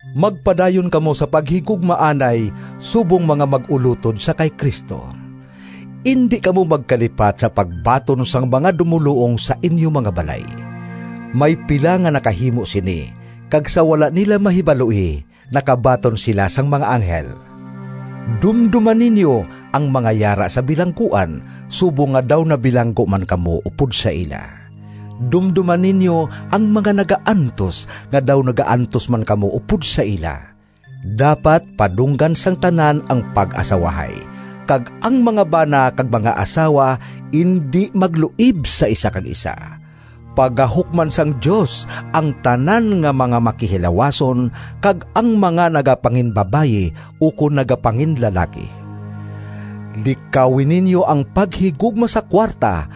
Magpadayon kamo sa paghigugmaanay subong mga mag-ulotod sa kay Cristo. Indi kamo magkalipat sa pagbaton sang mga dumoluong sa inyo mga balay. May pila nga nakahimo sini kag sa wala nila mahibaloi nakabaton sila sang mga anghel. Dumdoma ninyo ang mga yara sa bilangguan, subong nga daw nabilanggo man kamo upod sa ila. Dumdoma ninyo ang mga nagaantos, nga daw nagaantos man kamo upod sa ila. Dapat padunggan sang tanan ang pag-asawahay, kag ang mga bana kag mga asawa indi magluib sa isa kag isa. Pagahukman sang Dios ang tanan nga mga makihilawason kag ang mga nagapanginbabayi ukon nagapanginlalaki. Likawi ninyo ang paghigugma sa kuwarta,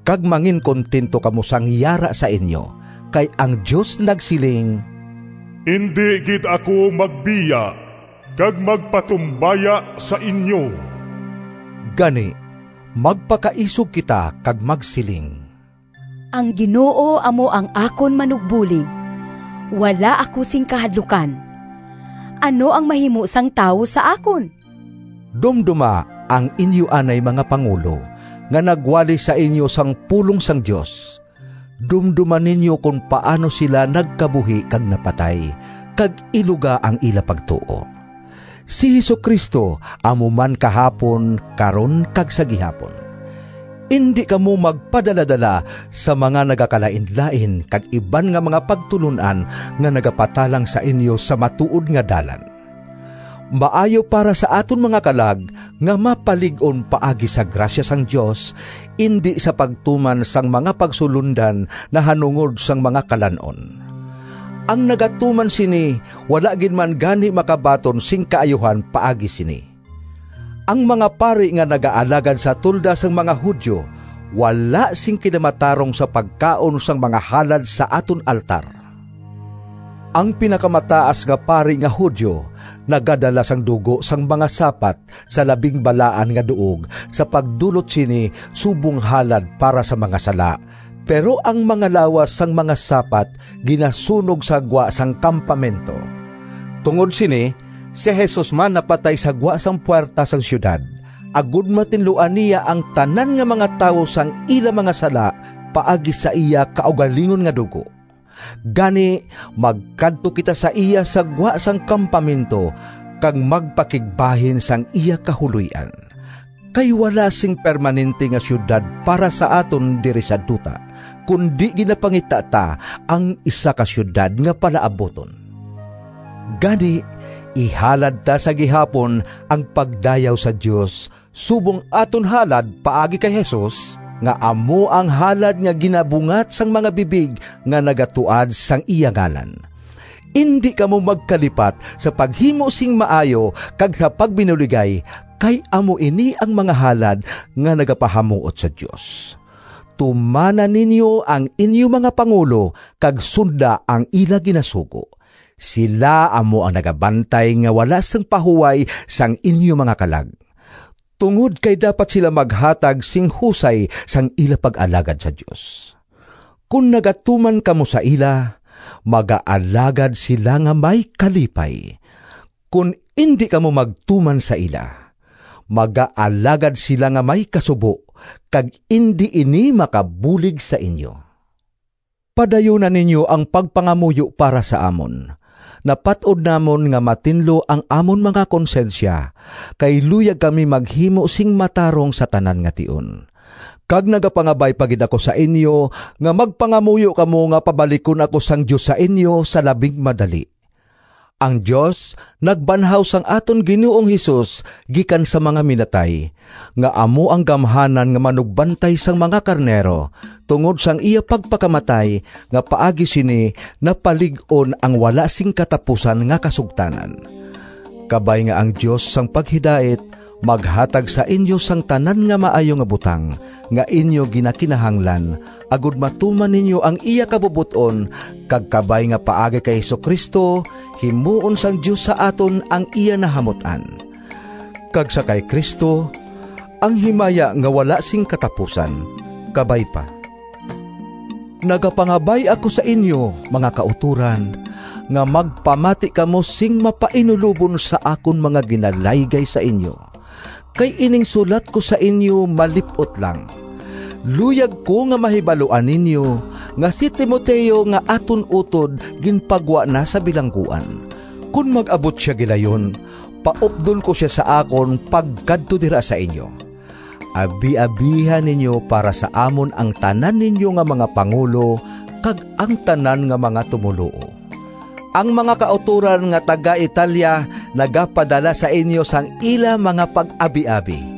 kag manginkuntento kamo sang yara sa inyo. Kay ang Dios nagsiling, “Indi gid ako magbiya kag magpatumbaya sa inyo.” Gani magpakaisog kita kag magsiling: “Ang Ginoo amo ang akon manugbulig, Wala ako sing kahadlukan. Ano ang mahimo sang tawo sa akon?” Dumdoma ang inyo anay mga pangulo, nga nagwali sa inyo sang pulong sang Dios. Dumdoma ninyo kon paano sila nagkabuhi kag napatay, kag iluga ang ila pagtuo. Si Jesu-Cristo amo man kahapon, karon kag sa gihapon. Indi kamo magpadaladala sa mga nagakalainlain kag iban nga mga pagtulon-an nga nagapatalang sa inyo sa matuod nga dalan. Maayo para sa aton mga kalag nga mapalig-on paagi sa grasya sang Dios, indi sa pagtuman sang mga pagsulondan nahanungod sang mga kalan-on. Ang nagatuman sini wala gid man gani makabaton sing kaayuhan paagi sini. Ang mga pari nga nagaalagad sa tolda sang mga Judio wala sing kinamatarong sa pagkaon sang mga halad sa aton altar. Ang Pinakamataas nga Pari nga Judio nagadala sang dugo sang mga sapat sa Labing Balaan nga Duog sa pagdulot sini subong halad para sa mga sala, pero ang mga lawas sang mga sapat ginasunog sa gwa sang kampamento. Tungod sini si Jesus man napatay sa gwa sang puwerta sang siyudad, agod matinluan niya ang tanan nga mga tawo sang ila mga sala paagi sa iya kaugalingon nga dugo. Gani, magkadto kita sa iya sa gwa sang kampamento kag magpakigbahin sang iya kahuloy-an. Kay wala sing permanente nga siyudad para sa aton diri sa duta, kundi ginapangita ta ang isa ka siyudad nga palaabuton. Gani, ihalad ta sa gihapon ang pagdayaw sa Dios subong aton halad paagi kay Jesus, nga amo ang halad nga ginabungat sang mga bibig nga nagatuad sang iya ngalan. Indi kamo magkalipat sa paghimo sing maayo kag sa pagbinuligay, kay amo ini ang mga halad nga nagapahamuot sa Dios. Tumana ninyo ang inyo mga pangulo kag sunda ang ila ginasugo. Sila amo ang nagabantay nga wala sing pahuway sang inyo mga kalag, tungod kay dapat sila maghatag sing husay sang ila pag-alagad sa Dios. Kon nagatuman kamo sa ila, magaalagad sila nga may kalipay. Kon indi kamo magtuman sa ila, magaalagad sila nga may kasubo kag indi ini makabulig sa inyo. Padayuna ninyo ang pagpangamuyo para sa amon. Napat-od namon nga matinlo ang amon mga konsyensya, kay luyag kami maghimo sing matarong sa tanan nga tion. Kag nagapangabay pa gid ako sa inyo nga magpangamuyo kamo nga pabalikon ako sang Dios sa inyo sa labing madali. Ang Dios nagbanhaw sang aton Ginoong Jesus gikan sa mga minatay nga amo ang Gamhanan nga Manugbantay sang mga karnero tungod sang iya pagpakamatay, nga paagi sini napalig-on ang wala sing katapusan nga kasugtanan. Kabay nga ang Dios sang paghidait maghatag sa inyo sang tanan nga maayo nga butang nga inyo ginakinahanglan agod matuman ninyo ang iya kabubot-on, kag kabay nga paagi kay Jesu-Cristo, himuon sang Dios sa aton ang iya nahamut-an. Kag sa kay Cristo ang himaya nga wala sing katapusan! Kabay pa. Nagapangabay ako sa inyo, mga kautoran, nga magpamati kamo sing mapainulobon sa akon mga ginalaygay sa inyo, kay ining sulat ko sa inyo malip-ot lang. Luyag ko nga mahibaluan ninyo nga si Timoteo nga aton utod ginpagwa na sa bilangguan. Kon mag-abot sia gilayon, paupdon ko sia sa akon pagkadto dira sa inyo. Abiabiha ninyo para sa amon ang tanan ninyo nga mga pangulo kag ang tanan nga mga tumoluo. Ang mga kautoran nga taga-Italia nagapadala sa inyo sang ila mga pag-abiabi.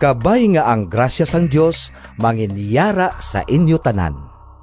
Kabay nga ang grasya sang Dios manginyara sa inyo tanan.